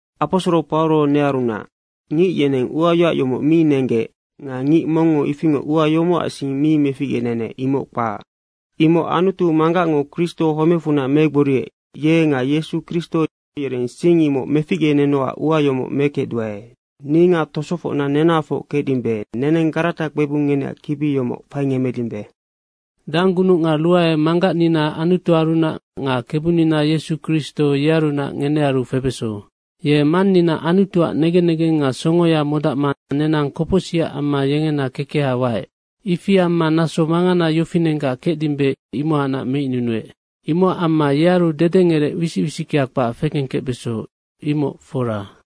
Aposoro Pauro nearunac. Ngic yeneng uayoac yomoc mi nenggec nga ngic mongngo ifingoc ua yomocac sing mi meficgenenec, imoc kpac. Imoc Anutu Manggacngo, Kristo homecfunac megboriec, ye nga Yesu Kristo yereng sing imoc meficgenenocac ua yomoc mekecduae. Ni nga tosofocna nenahafoc kecdimbe, neneng Garata kpebung ngeneac kibi yomoc faingemmedimbe. Danggunuc nga ruae Manggacnina Anutuarunac nga Kebunina Yesu Kristo yearunac ngenearu febeso. Ye Mannina Anutuac negen negeng nga songoya modacma nenang kopocsicac amma yengena kekeha waec. Ifi amma naso mangana yofinenggac kecdimbe, imohacnac meicnunuec. Imocac amma yearu dedengerec wisic wisickea kpac fekengkecbeso, imoc fora.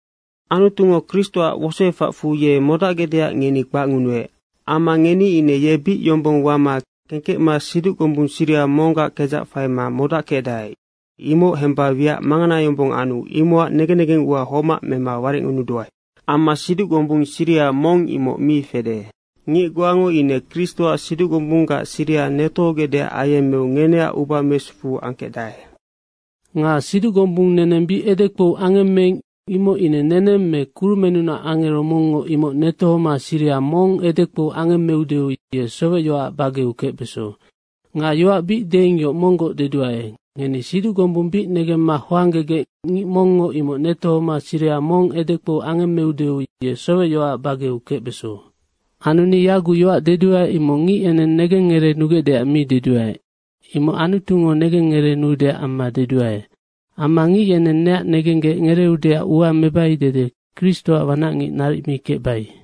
Anutungo Kristoac wosoefacfu ye modacgecdeac ngeni kpacngunuec. Amma ngeni ine ye bic yombong wama kengkecma siduc gombung siriha monggac kedzac faima modackecdae, imoc hemba wiac mangana yombong anu imocac negen negengua homac mema warecngunuduae. Amma siduc gombung siriha mong imoc mi fede. Ngic goango ine Kristoac siduc gombunggac siriha netohogecdeac ayemmeu ngeneac uba mesufu angkecdae. Nga siduc gombung neneng bic edekpou angemmeing, imoc ine neneng me kurumennunac angero mongngo, imoc netohoma siriha mong edekpou angemmeudeu ye sowecyoacac bageu kecbeso. Nga yoac bic deing yoc monggoc deduae, ngeni siduc gombung bic negemma hoanggegec, ngic mongngo imoc netohoma siriha mong edekpou angemmeudeu ye sowecyoacac bageu kecbeso. Anu ni yaguc yoac deduae, imoc ngic yeneng negen ngereenugecdeac mi deduae. Imoc Anutungo negen ngereenuudeac amma deduae. Amma ngic yeneng neac negenggec ngereeudeac ua mebai dede Kristoac wanacngic naric mi kecbai.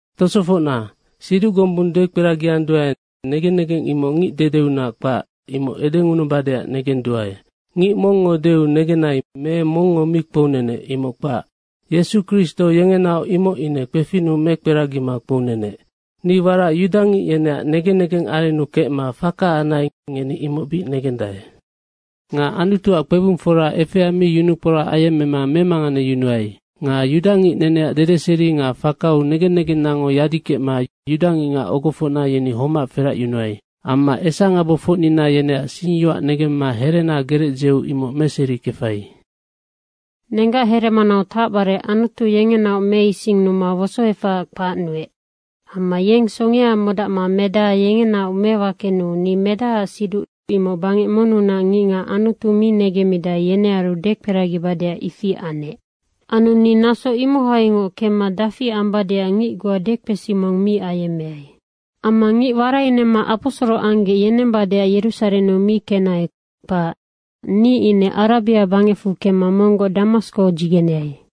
Tosofocna, siduc gombung dekperagianduae, negen negeng imoc ngic dedeunac kpac, imoc edengunubadeac negenduae. Ngic mongngo deu negenai me mongngo mi kpounenec, imoc kpac. Yesu Kristo yengenaoc imoc ine kpefinnu mekperagima kpounenec. Ni warac yudangic yeneac negen negeng arennu kecma faka anai, ngeni imoc bic negendae. Nga Anutuac kpebungfora efea mi yunukporac ayemmema memanganeyunuai. Nga yudangic neneac dedeseri nga fakau negen negennango yadikecma yudangicngac ogofocna yeni homac feracyunuai. Amma esangabofocnina yeneac singyoac negemma herena gerec dzeu imoc meserikefai. Nenggac heremanau tacbare Anutu yengenaoc meisinnuma wosoefahaac kpacnuec. Amma yeng songea modacma Medaha yengenaoc mewakenuu ni Medahaac siduc imoc bangec monnunac ngicngac Anutu mi negemmidae, yenearu dekperagibadeac ifi anec. Anu ni naso imohaingoc kemma dafi ambadeac ngic goa dekpesi mong mi ayemmeai. Amma ngic warainemma aposoro anggec yenembadeac Yerusarennu mi kenai, kpac. Ni ine Arabia bangecfu kemma monggoc Damasko dzigeneai.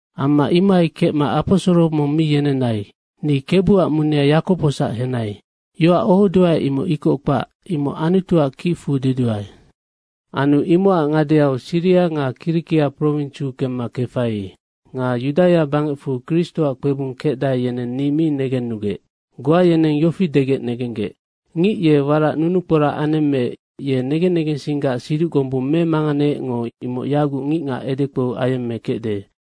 Amma imohai kecma aposoro mong mi yenenai. Ni Kebuac munea Yakobosac henai. Yoac ohoduae imoc ikoc kpac, imoc Anutuac kicfu deduae. Anu imocac ngadeau Siria nga Kirikia prowinsiu kemma kefai. Nga Yudaia bangecfu Kristoac kpebung kecdae, yeneng ni mi negennugec. Goa yeneng yofi degec negenggec, “Ngic ye warac nunukporac anemmeec, ye negen negensinggac siduc gombung memanganeecngo imoc yaguc ngicngac edekpou ayemmekecde.”